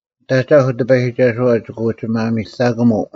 ᓂᑦ ᐊᒐᐧᒄ ᑎᐸᔨᒋᒐᓱᐛ ᒋᑭ ᐅᒋ ᒪᒥᑕᑯᒧᐤ: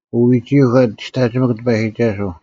ᐅ ᐎᒋᐃᒄ ᐊ ᒋᔅᑕᒋᒥᒄ ᑎᐸᔨᒋᒐᓱᐤ,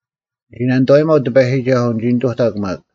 ᓂᒋ ᓇᓂᑐᐛᔨᒪᐤ ᑎᐸᔨᒋᒐᓱᐤ, ᓂᒋ ᓂᑐᑕᒄ ᒪᒃ,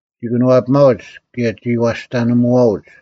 ᒋ ᑭᓄᐛᐱᒪᐅᒡ, ᑭᔭ ᒋ ᐛᔅᑕᓂᒧᐛᐅᒡ;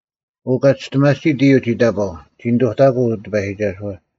ᐅ ᑲ ᒋᔅᑎᒪᑎᓯᑦ ᐃᔪᐤ ᒋ ᑕᑈᐤ, ᒋ ᓂᑐᑕᑎᑯᐤ ᑎᐸᔨᒋᒐᓱᐛ,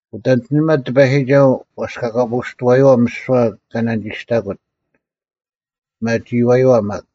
ᐅᑦ ᐊᓐᒋᓂᒪ ᑎᐸᔨᒋᒐᓱᐤ ᐛᔅᑲᑲᐳᐅᔅᑐᐛᔪᐛ ᒥᓯᐛ ᑲ ᓇᓂᒋᔅᑕᑯᑦ, ᐱᒪᒋᐃᐛᔪᐛ ᒪᒃ᙮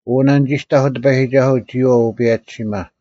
ᐅ ᓇᓂᒋᔅᑕᐧᒄ ᑎᐸᔨᒋᒐᓱᐤ, ᒋᔨᐛᐤ ᐅᐸᔭᒋᓯᒪ: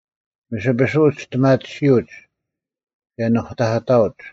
ᒥᓯᐱᓱᐅᒡ ᒋᔅᑎᒪᑎᓯᐅᒡ, ᑭᔭ ᓄᑕᐧᑭᑕᐅᒡ: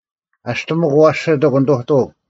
ᐊᔅᑎᒥᒄ, ᐊᐛᓯᑐᒄ, ᓂᑐᑐᐅᒄ: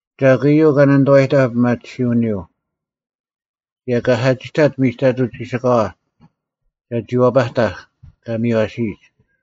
ᒐᒄ ᐃᔪᐤ ᑲ ᓂᑐᐛᔨᑕᐧᒃ ᐱᒪᑎᓯᐅᓂᔪᐤ, ᑭᔭ ᑲ ᓴᒋᑕᑦ ᒥᒐᑐᐤ ᒋᓯᑲᐛ, ᒐᒋ ᐛᐸᑕᐧᒃ ᑲ ᒥᔽᓯᔨᒡ?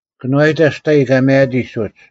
ᑭᓄᐛᔨᑕ ᒋᑕᔨᔾ ᑲ ᒪᔭᑎᒡ ᐅᒡ,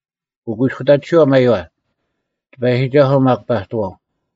ᐅᑯᐃᔅᑯᑕᑎᓯᐛ ᒪᔪᐛ, ᑎᐸᔨᒋᒐᓱᐤ ᒪᒃ ᐸᑐᐛᐤ,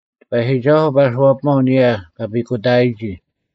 ᑎᐸᔨᒋᒐᓱᐤ ᐸᓱᐛᐱᒪᐤ ᐊᓂᔭ ᑲ ᐱᑯᑕᐊᔨᒋ;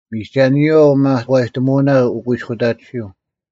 ᒥᒐᓂᔪᐛ ᐅᒪᒂᔨᑕᒧᐅᓇ ᐅᑯᐃᔅᑯᑕᑎᓯᐤ: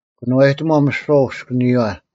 ᑭᓄᐛᔨᑎᒺᐤ ᒥᓯᐛ ᐅᔅᑭᓂᔪᐛ: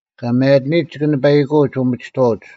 ᑲ ᒪᔭᑎᓂᔨᒡ ᒋᑭ ᓂᐸᐃᑯᐅᒡ ᐅᒥᒋᑥᐅᒡ: